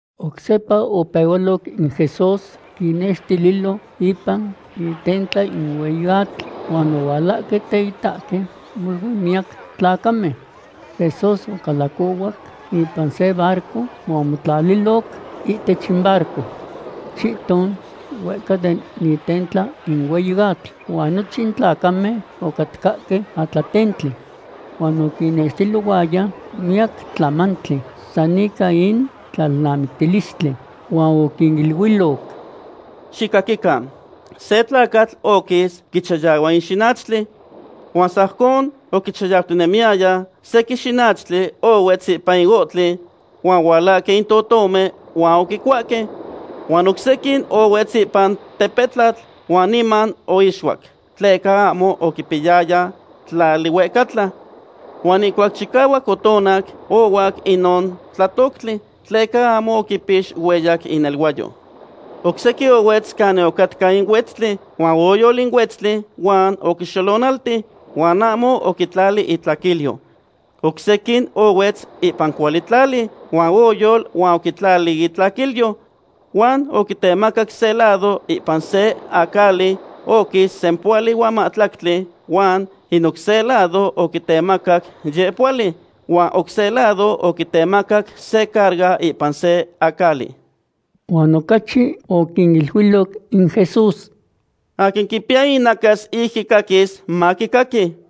Oc sepa opehualoc in Jesús quinnextililo ipan itentla in hueyi atl, huan ohualahque teitahque molui miyac tlacamen. Jesús ocalacohuac ipan se barco huan omotlaliloc ihtech in barco chihton huehca den itentla in hueyi atl, huan nochin tlacamen ocatcahque atlatentli. Huan oquinnextililohuaya miyac tlamantli san ica in tlalnamictilistli, huan oquiniluiloc: ―Xicaquican, se tlacatl oquis quichayahua in xinachtli. Huan sajcon oquichayautinemiyaya, sequin xinachtli ohuetz ipan in ohtli huan ohualahque in totomen huan oquicuahque. Huan oc sequin ohuetz ipan tepetlatl huan niman oixuac, tleca ahmo oquipiyaya tlali huehcatla. Huan ihcuac chicahuac otonac, ohuac inon tlatoctli, tleca ahmo oquipix hueyac ineluayo. Oc sequin ohuetz canin ocatca in huetztli, huan oyol in huetztli huan oquixolonalti, huan ahmo oquitlali itlaquilyo. Oc sequin ohuetz ipan cuali tlali, huan oyol huan oquitlali itlaquilyo. Huan oquitemacac se lado ipan se acali oquis sempohuali huan mahtlactli, huan in oc se lado oquitemacac yehpohuali, huan oc se lado oquitemacac se carga ipan se acali. Huan ocachi oquiniluiloc in Jesús: ―Aquin quipiya inacas ic quicaquis, maquicaqui.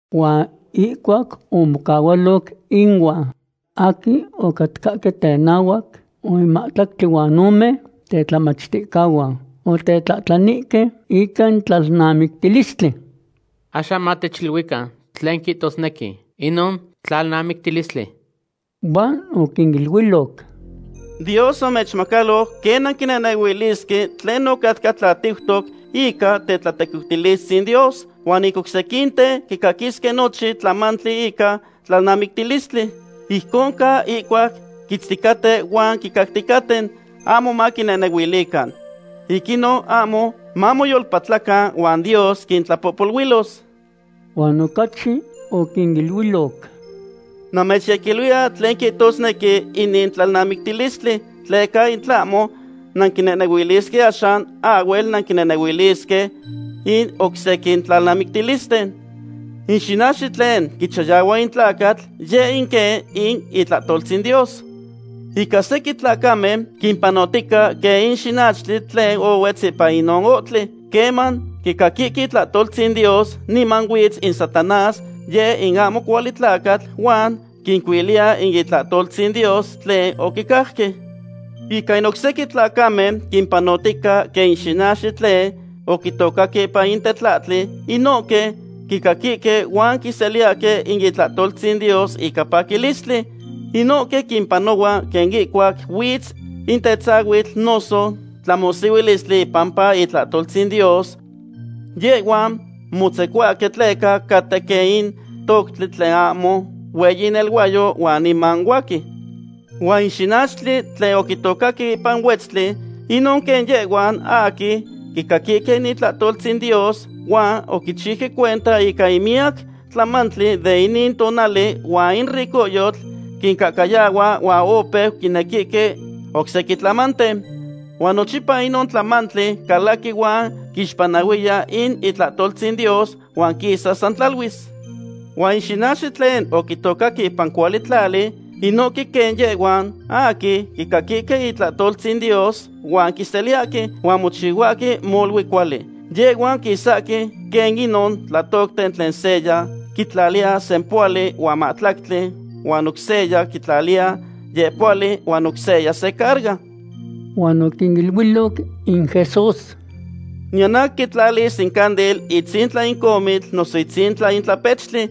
Huan ihcuac omocahualoc inuan aquin ocatcahque tenahuac huan in mahtlactli huan ome tetlamachticahuan, otetlahtlanihque ica in tlalnamictilistli: ―Axan matechiluican tlen quihtosnequi inon tlalnamictilistli. Huan oquiniluiloc: ―Dios omechmacaloc quen nanquinehnehuilisque tlen ocatca tlatiutoc ica tetlatequiutilistzin Dios, huan in oc sequinten quicaquisque nochin tlamantli ica tlalnamictilistli. Ijcon ca ihcuac quitzticaten huan quicacticaten, ahmo maquinehnehuilican. Ic inon ahmo mamoyolpatlacan huan Dios quintlapohpoluilos. Huan ocachi oquiniluiloc: ―Namechyequiluiya tlen quihtosnequi inin tlalnamictilistli tleca in tlahmo nanquinehnehuilisque axan, ahhuel nanquinehnehuilisque in oc sequin tlalnamictilisten. In xinachtli tlen quichayahua in tlacatl yeh in quen in itlahtoltzin Dios. Ica sequin tlacamen quimpanotica quen in xinachtli tlen ohuetz ipan inon ohtli. Queman quicaquihque itlahtoltzin Dios niman huitz in Satanás, yeh in ahmo cuali tlacatl, huan quincuiliya in itlahtoltzin Dios tlen oquicajque. Ica in oc sequin tlacamen quimpanotica quen in xinachtli tlen oquitocaque ipan in tetlahtli. Inohque quicaquihque huan quiseliyahque in itlahtoltzin Dios ica paquilistli. Inohque quimpanohua quen ihcuac huitz in tetzahuitl noso tlamohsihuilistli ipampa itlahtoltzin Dios. Yehhuan motzecohuahque tleca caten quen in toctli tlen ahmo hueyi ineluayo huan niman huaqui. Huan in xinachtli tlen oquitocaque ipan huetztli, inon quen yehhuan aquin quicaquihque in itlahtoltzin Dios, huan oquichiuque cuenta ica in miyac tlamantli de inin tonali huan in ricohyotl quincahcayahua huan opeu quinequihque oc sequin tlamanten. Huan nochipa inon tlamantli calaqui huan quixpanahuiya in itlahtoltzin Dios, huan quisa san tlaluis. Huan in xinachtli tlen oquitocaque ipan cuali tlali, inohque quen yehhuan aquin quicaquihque in itlahtoltzin Dios huan quiseliyahque, huan mochihuahque molui cuali. Yehhuan quisahque quen inon tlatocten tlen seya quitlaliya sempohuali huan mahtlactli, huan oc seya quitlaliya yehpohuali, huan oc seya se carga. Huan oquiniluiloc in Jesús: ―Niyan aquin quitlalis in candil itzintla in comitl noso itzintla in tlapechtli.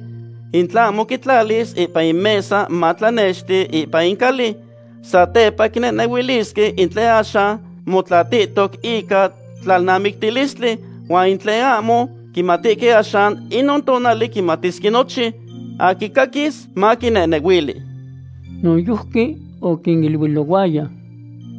In tlahmo quitlalis ipan in mesa matlanexti ipan in cali. Satepa quinehnehuilisque in tlen axan motlatitoc ica tlalnamictilistli, huan in tlen ahmo quimatihque axan, inon tonali quimatisque nochin. Aquin quicaquis, maquinehnehuili. Noyojqui oquiniluilohuaya: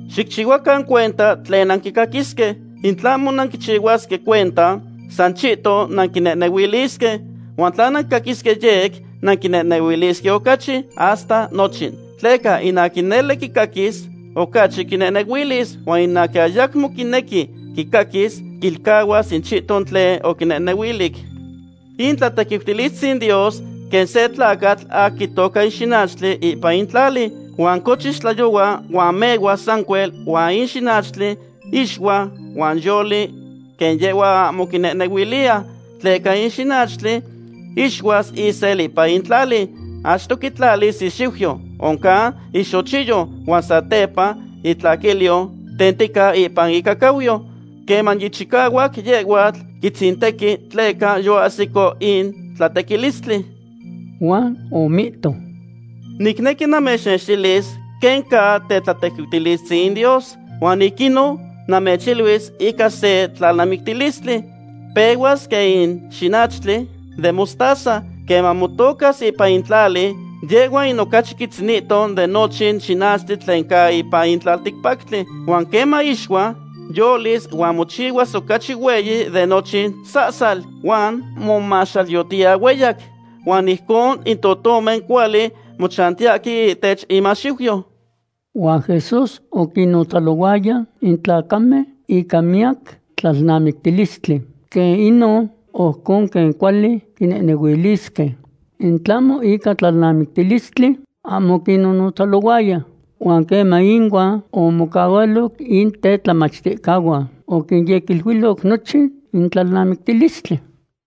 ―Xicchihuacan cuenta tlen nanquicaquisque. In tlahmo nanquichihuaque cuenta, san chihton nanquinehnehuilisque, huan tla nanquicaquisque yec, nanquinehnehuilisque ocachi, hasta nochin. Tleca in aquin nele quicaquis, ocachi quinehnehuilis, huan in aquin ayacmo quinequi quicaquis, quilcahuas in chihton tlen oquinehnehuilic. In tlatequiutilistzin Dios quen se tlacatl aquin quitoca in xinachtli ipan in tlali. Huan cochis tlayohua huan mehuas sancuel huan in xinachtli ixua huan yoli quen yehhua ahmo quinehnehuiliya. Tleca in xinachtli ixuas isel ipan in tlali, achto quitlalis ixiuyo, oncan ixochiyo, huan satepa itlaquilyo tentica ipan icacauyo. Queman yichicahuac, yehhuatl quitzintequi, tleca yoahsico in tlatequilistli. Huan omihto: ―Nicnequi namechnextilis quen ca tetlatequiutilistzin in Dios, huan ic inon namechiluis ica se tlalnamictilistli. Pehuas quen in xinachtli den mostaza. Queman motocas ipan in tlali, yehhua in ocachi quitzinihto den nochin xinachtli tlen ca ipan in tlalticpactli. Huan queman ixua, yolis huan mochihuas ocachi hueyi de nochin sahsal, huan momahxalyotiya hueyac, huan ijcon in totomen cuali mochantiyahque ihtech imaxiuyo. Huan Jesús oquinnotzalohuaya in tlacamen ica miyac tlalnamictilistli quen inon, ojcon quen cuali quinehnehuilisque. In tlahmo ica tlalnamictilistli, ahmo oquinnotzalohuaya. Huan queman inuan omocahualoc in tetlamachticahuan, oquinyequiluiloc nochin in tlalnamictilistli.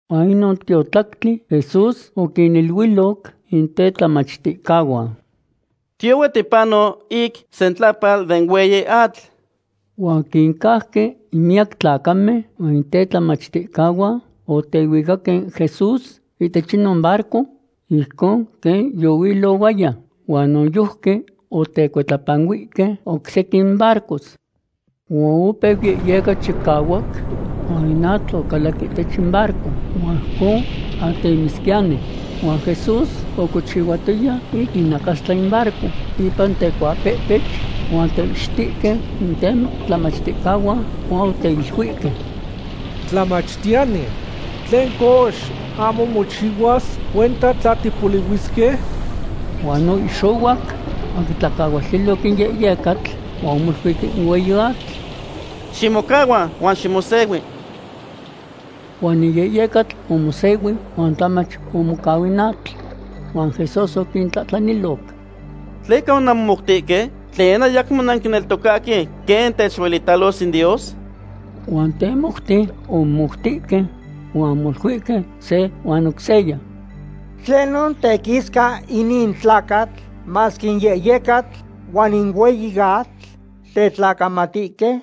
Huan inon tiotlactli Jesús oquiniluiloc in tetlamachticahuan: ―Tiyohue tipano ic sentlapal den hueyi atl. Huan oquincauque in miyac tlacamen huan in tetlamachticahuan otehuicaque Jesús ihtech inon barco ijcon quen yohuilohuaya, huan noyojqui otecuitlapanuihque oc sequin barcos. Huan opeu yehyeca chicahuac, huan in atl ocalac ihtech in barco, huan ijcon atemisquiyani. Huan Jesús ocochihuatoya ic inacastla in barco ipan tecuapehpech. Huan oteihxitihque in tetlamachticahuan huan oteiluihque: ―¡Tlamachtiyani! ¿Tlen cox, ahmo mochihuas cuenta tla tipolihuisque? Huan oihxohuac huan oquitlacahualtiloc in yehyecatl, huan omoluic in hueyi atl: ―¡Ximocahua huan ximosehui! Huan in yehyecatl omosehuic huan tlamach omocau in atl. Huan Jesús oquintlahtlaniloc: ―¿Tleca onanmomoutihque? ¿Tlen, ayamo nanquineltocahque quen techuelitalos in Dios? Huan temoute omomoutihque huan omoluihque se huan oc seya: ―¿Tlenon tequisca inin tlacatl, masque in yehyecatl huan in hueyi atl tetlacamatihque?